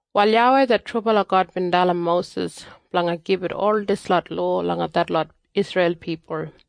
Wal YAWEI det trubala God bin dalim Mosis blanga gibit ol dislot lowa langa detlot Isreil pipul.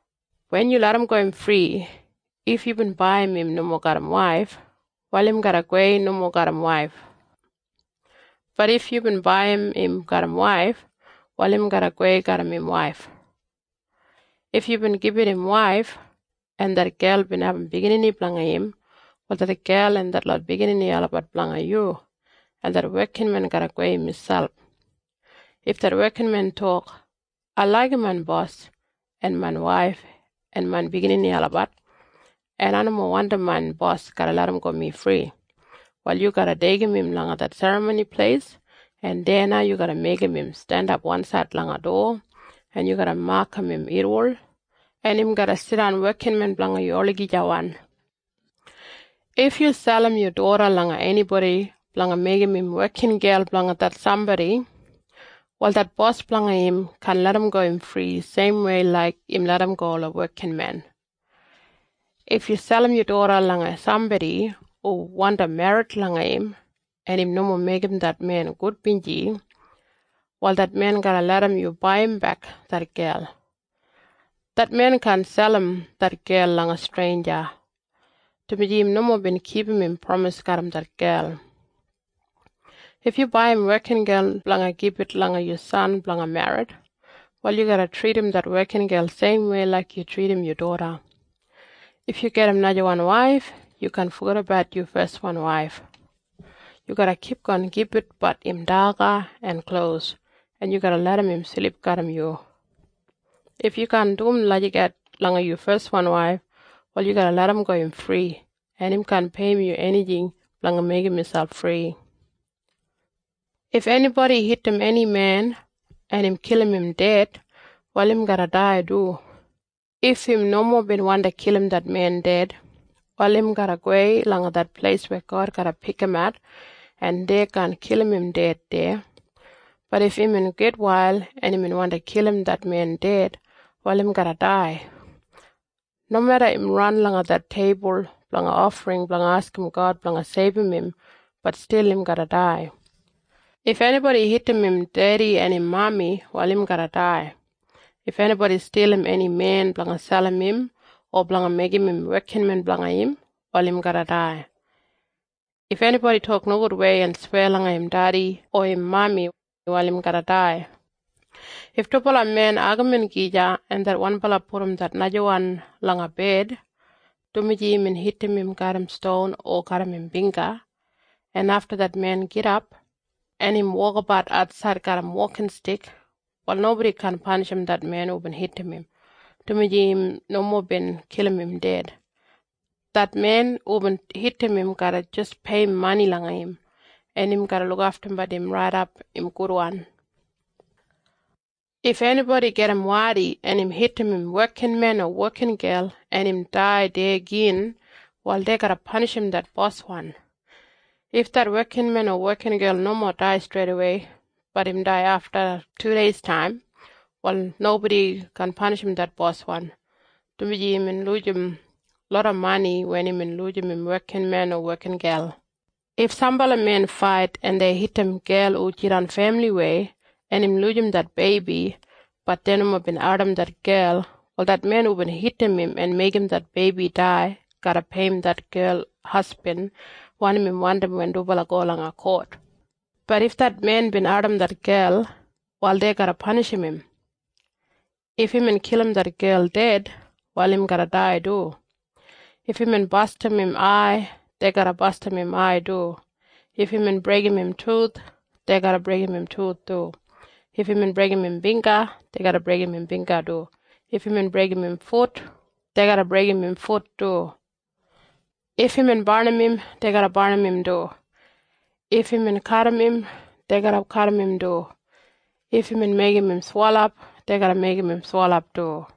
Wen yu larramgo im fri, if yubin baiyim im nomo garram waif, wal im garra gowei nomo garram waif. Bat if yubin baiyim im garram waif, wal im garra gowei garram im waif. If yubin gibit im waif, en det gel bin abum biginini blanga im, wal det gel en detlot biginini olabat blanga yu, en det wekinmen garra gowei miselp. If det wekinmen tok, “Ai laigim main bos en main waif en main biginini olabat, en ai nomo wandim main bos garra larramgo mi fri,” wal yu garra deigim im langa det Serramoni Pleis, en deya na yu garra meigim im jandap wansaid langa dowa, en yu garra makam im irriwol, en im garra jidan wekinmen blanga yu olagijawan. If yu selim yu doda langa enibodi blanga meigim im wekingel blanga det sambodi, wal det bos blanga im kaan larramgo im fri seimwei laik im larramgo ola wekinmen. If yu selim yu doda langa sambodi hu wandi merrit langa im, en im nomo meigim det men gudbinji, wal det men garra larram yu baiyimbek det gel. Det men kaan selim det gel langa streinja, dumaji im nomo bin kipum im pramis garram det gel. If yu baiyim wekingel blanga gibit langa yu san blanga merrit, wal yu garra tridim det wekingel seimwei laik yu tridim yu doda. If yu gedim najawan waif, yu kaan fogedabat yu feswan waif. Yu garra kipgon gibitbat im daga en klos, en yu garra larram im silip garram yu. If yu kaan dum lagijat langa yu feswan waif, wal yu garra larramgo im fri, en im kaan peiyim yu enijing blanga meigim miselp fri. If enibodi hitim eni men, en im kilim im ded, wal im garra dai du. If im nomo bin wandi kilim det men ded, wal im garra gowei langa det pleis weya God garra pikimat, en dei kaan kilim im ded deya. Bat if imbin gitwail, en imbin wandi kilim det men ded, wal im garra dai. Nomeda im ran langa det teibul blanga ofring blanga askim God blanga seibum im, bat stil im garra dai. If enibodi hitim im dedi o im mami, wal im garra dai. If enibodi stilim eni men blanga selim im o blanga meigim im wekinmen blanga im, wal im garra dai. If enibodi tok nogudwei en sweya langa im dedi o im mami, wal im garra dai. If dubala men agamin gija, en det wanbala pudum det najawan langa bed, dumaji imbin hitim im garram ston o garram im bingga, en afta det men gidap, en im wokabat atsaid garram wokinstik, wal nobodi kaan panishim det men hubin hitim im, dumaji im nomo bin kilim im ded. Det men hubin hitim im garra jis peiyim mani langa im, en im garra lukaftumbat im raidap im gudwan. If enibodi gajim wadi, en im hitim im wekinmen o wekingel, en im dai deya gin, wal dei garra panishim det boswan. If det wekinmen o wekingel nomo dai streidawei, bat im dai afta tudeistaim, wal nobodi kaan panishim det boswan, dumaji imbin lujim loda mani wen imbin lujim im wekinmen o wekingel. If sambala men fait, en dei hitim gel hu jidan femiliwei, en im lujim det beibi, bat dei nomo bin ardim det gel, wal det men hubin hitim im en meigim det beibi dai garra peiyim det gel hasbin wanim im wandim wen dubala go langa kot. Bat if det men bin ardim det gel, wal dei garra panishim im. If imbin kilim det gel ded, wal im garra dai du. If imbin bastim im ai, dei garra bastim im ai du. If imbin breigim im tuth, dei garra breigim im tuth du. If imbin breigim im bingga, dei garra breigim im bingga du. If imbin breigim im fut, dei garra breigim im fut du. If imbin barnim im, dei garra barnim im du. If imbin kadim im, dei garra kadim im du. If imbin meigim im swelap, dei garra meigim im swelap du.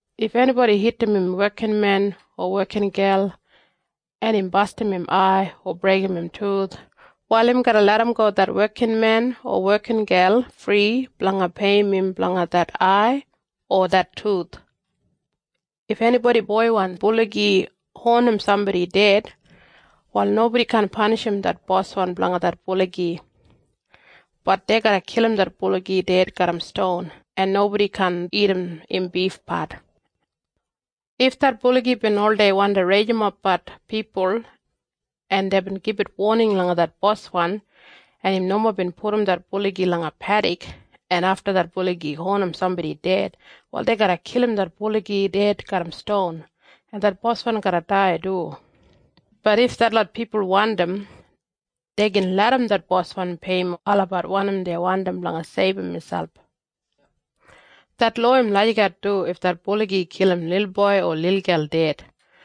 If enibodi hitim im wekinmen o wekingel, en im bastim im ai o breigim im tuth, wal im garra larramgo det wekinmen o wekingel fri blanga peiyim im blanga det ai o det tuth. If enibodi boiwan buligi honim sambodi ded, wal nobodi kaan panishim det boswan blanga det buligi. Bat dei garra kilim det buligi ded garram ston, en nobodi kaan dagat im bifpat. If det buligi bin oldei wandi rijimbat pipul, en deibin gibit woning langa det boswan, en im nomo bin pudum det buligi langa pedik, en afta det buligi honim sambodi ded, wal dei garra kilim det buligi ded garram ston, en det boswan garra dai du. Bat if detlot pipul wandim, dei gin larram det boswan peiyim olabat wanim dei wandim blanga seibum miselp. Det lowa im lagijat du if det buligi kilim lilboi o lilgel ded.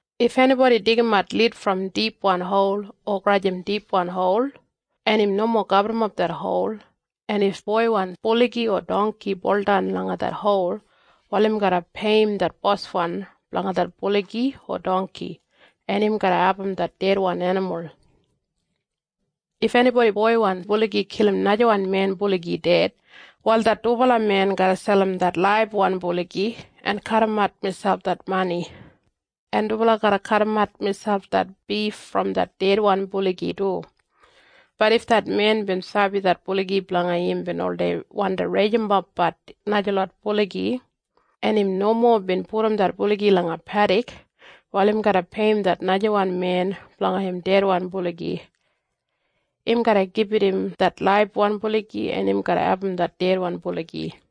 If enibodi deigimat lid brom dipwan hol o grajim dipwan hol, en im nomo gaburrumap det hol, en if boiwan buligi o dongki buldan langa det hol, wal im garra peiyim det boswan blanga det buligi o dongki, en im garra abum det dedwan enimul. If enibodi boiwan buligi kilim najawan men buligi ded, wal det dubala men garra selim det laibwan buligi en kadimat miselp det mani, en dubala garra kadimat miselp det bif brom det dedwan buligi du. Bat if det men bin sabi det buligi blanga im bin oldei wandi rijimbat najalot buligi, en im nomo bin pudum det buligi langa pedik, wal im garra peiyim det najawan men blanga im dedwan buligi. Im garra gibit im det laibwan buligi, en im garra abum det dedwan buligi.